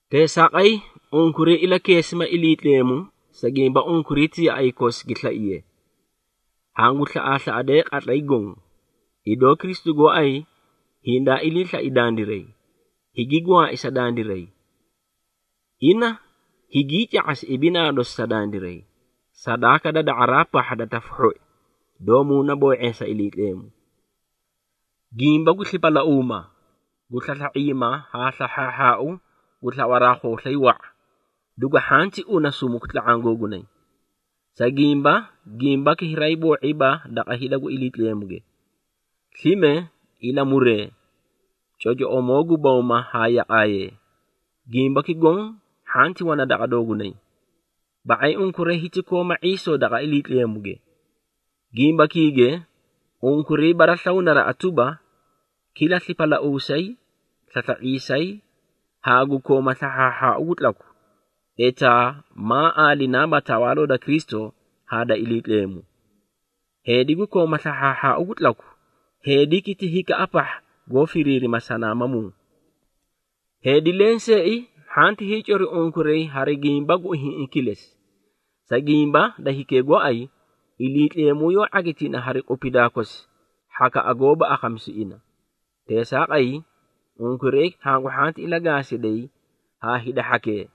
Teesaaqay, unkuray ilakeesima Iliitleemu, sa gimba unkuray ti yaꞌay kosi gi slaiye. Hangu slaꞌaaslaꞌadee qatlay goõ, idoo Kristu gooay hindaa ilii slai dandiray, higi gwaai sa dandiray. Ina higii ca⁄asi ibinaa dosi sa dandiray, sadaaka da da⁄araa pahha da tafu hhoi, doó muunaboo⁄eesa Iliitleemu. Gimba gu slipalauuma, gu slasla⁄iima haa slahhaahhaau gu slawaraa khooslay wa⁄a, dugu hhanti una sumuku tla⁄aã googunay. Sa gimba, gimbaki hiraay boo⁄iiba daqa hida gu Iliitleemuge. Slime, ilamuree, cocoꞌomoo gu bawma haa yaqaayee, gimbaki goõ hhanti wana daqa doogunay. Ba⁄ay unkuray hiti kooma ⁄iisoo daqa Iliitleemuge. Gimbakiige unkuray baraslawu naraꞌa tuba, kila slipalauusay, slasla⁄iisay, haa gu kooma slahhaahhaau gu tlaku, etaa maa aalinaaba Tawaaloo da Kristu haa da Iliitleemu. Heedi gu kooma slahhaahhaau gu tlaku, heediki ti hikaꞌa pahha goó firiirima sanaamamuu. Heedi lenseei hhanti hiicori unkuray hari gimba gu ihiĩꞌi kilesi, sa gimba da hikee gooay, Iliitleemu yoó ⁄agitina hari qupidaa kosi hhakaꞌa goóba akhamisu ina. Teesaaqay, unkuray hangu hhanti ilagaasiday haa hida hhakee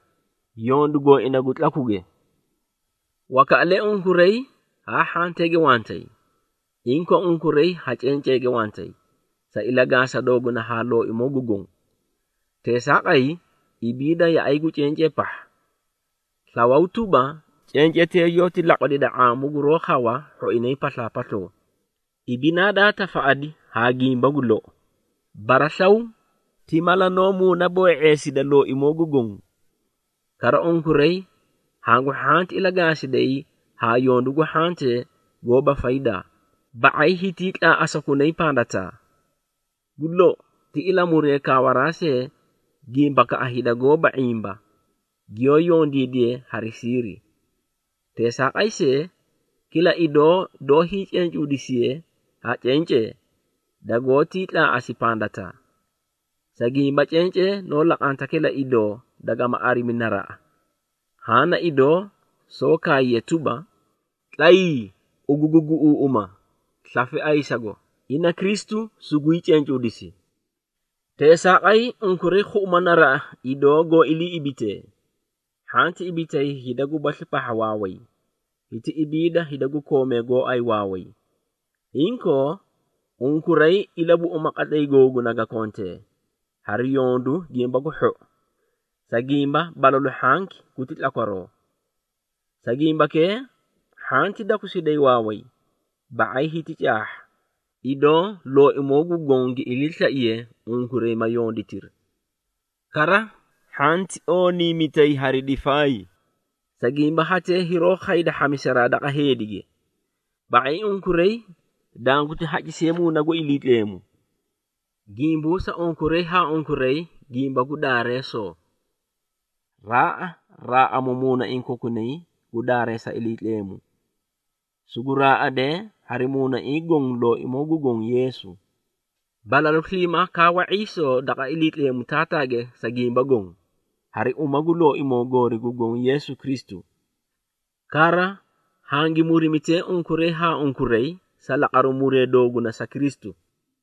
yondu gooina gu tlakuge. Wakaꞌalee unkuray haa hhanteege wantay. Inkoo, unkuray ha cenceege wantay, sa ilagaasa dooguna haa Looimoo gu Goõ. Teesaaqay, ibiida yaꞌay gu cencee pahha. Slawaw tuba, cencetee yoóti laqwalida ⁄aamu guroó khawa hhoinay paslaapasloo, ibinaa daa tafaꞌadi haa gimba gu lou. Baraslaw ti mala noó muunaboo⁄eesida Looimoo gu Goõ. Kara, unkuray hangu hhanti ilagaasiday haa yondu gu hhantee goóba faydaa, ba⁄ay hitii tlaaꞌasakunay pandataa. Gu lou, ti ilamuree kaawaraa see gimbakaꞌa hida goóba ⁄imba, giyoó yondiidiyee hari siiri. Teesaaqay see, kila idoo doó hiicencuudisiye ha cencee, dagoótii tlaa⁄asi pandataa. Sa gimba cencee noó laqanta kila idoo dagama arimi naraꞌa. Haã na idoo soó kaayiye tuba, “Tlayii, ugu gu guꞌuuꞌuma, slafe ayisago, ina Kristu sugwii cencuudisi.” Teesaaqay, unkuray khuꞌuma naraꞌa idoo goó iliiꞌibitee. Hhanti ibitay hida gubasli pahha waaway, hiti ibiida hida gu koomee gooay waaway. Inkoo, unkuray ilabuꞌuma qatlay googuna ga kontee, hari yondu gimba gu hhou, sa gimba balalu hhanki guti tlakwaroo. Sa gimbakee hhanti dakusiday waaway, ba⁄ay hiti caahha, idoo Looimoo gu Goõ gi iliislaiye, unkuray ma yonditiri. Kara, hhanti ooniimitay hari difaay, sa gimba hatee hiroó khayda hhamisaraa daqa heedige. Ba⁄ay unkuray danguti hacisiye Muuna gu Iliitleemu. Gimbuusa unkuray haa unkuray gimba gu Daareesoo, raaꞌa raaꞌamu muunaiĩ kokunaa gu daareesa Iliitleemu. Sugu raaꞌadee hari muunaiĩ goõ Looimoo gu Goõ Yeesu. Balalu sliimaa kaawa ⁄iisoo daqa Iliitleemu Taataage sa gimba goõ, hari uma gu Looimoo goori gu Goõ Yeesu Kristu. Kara, hangi murimitee unkuray haa unkuray, sa laqaru muree dooguna sa Kristu.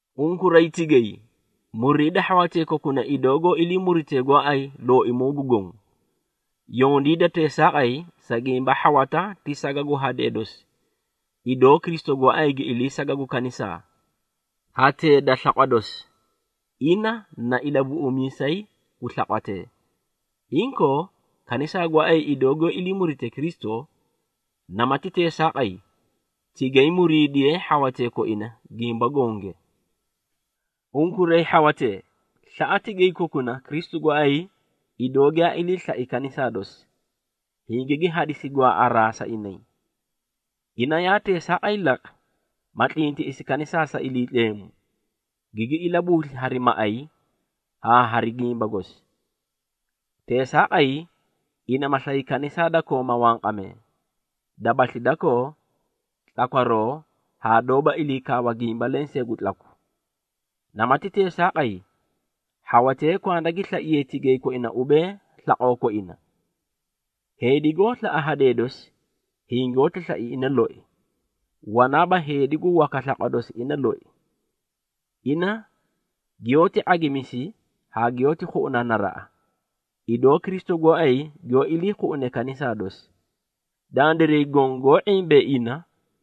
Unkuray tigay, muriida hhawatee kokuna, idoo goó ilii muritee gooay Looimoo gu Goõ. Yondiida teesaaqay, sa gimba hhawata ti saga gu hadee dosi, idoo Kristu gooay gi ilii saga gu kanisaa, hatee da slaqwa dosi. Ina na Ilabuꞌumiisay gu slaqwatee. Inkoo kanisaa gooay giyoó ilii murite Kristu, namati teesaaqay tigay muriidiyee hhawatee koina gimba gonge. Unkuray hhawatee, slaꞌa tigay kokuna, Kristu gooay idoo giyaa ilii slai kanisaa dosi, hingigi hadisi gwaaꞌaraa sa inay. Ina yaa teesaaqay laqi, ma tlintiꞌisi kanisaa sa Iliitleemu, gigi ilabuusli hari maꞌay haa hari gimba gosi. Teesaaqay, ina ma slay kanisaa da kooma wanqamee, dabasli dakoo, tlakwaroo haa doóba iliikaawa gimba lensee gu tlaku. Namati teesaaqay, hhawatee kwanda gi slaiyee tigay koina ubee slaqoo koina. Heedi goó slaꞌa hadee dosi, hingoóti slai ina loi. Wanaaba heedi gu waka slaqwa dosi ina loi. Ina giyoóti ⁄agimisi haa giyoóti khuꞌuna naraꞌa, idoo Kristu gooay giyoó iliikhuꞌune kanisaa dosi. Dandiray goõ goó ⁄imbee ina,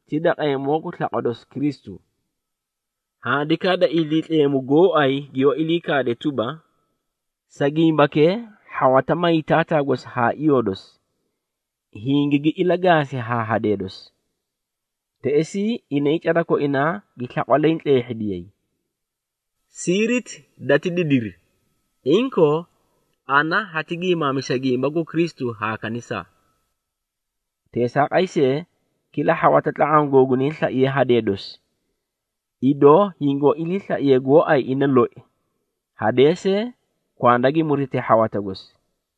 ti daqeemoo gu slaqwa dosi Kristu. Handikaa da Iliitleemu gooay giyoó ilii kaade tuba, “Sa gimbakee, hhawata may taataa haa iyoo dosi, hingigi ilagaasi haa hadee dosi. Teꞌesii inay cada koinaa gi slaqwa leẽ tleehhidiyay.” Siiriti dati didiri. Inkoo, ana hati giimaamisa gimba gu Kristu haa kanisaa. Teesaaqay see, kila hhawata tla⁄aã googunay slaiye hadee dosi, idoo hingoó iliislaiye gooay ina loi, hadee see kwanda gi murite hhawata gosi.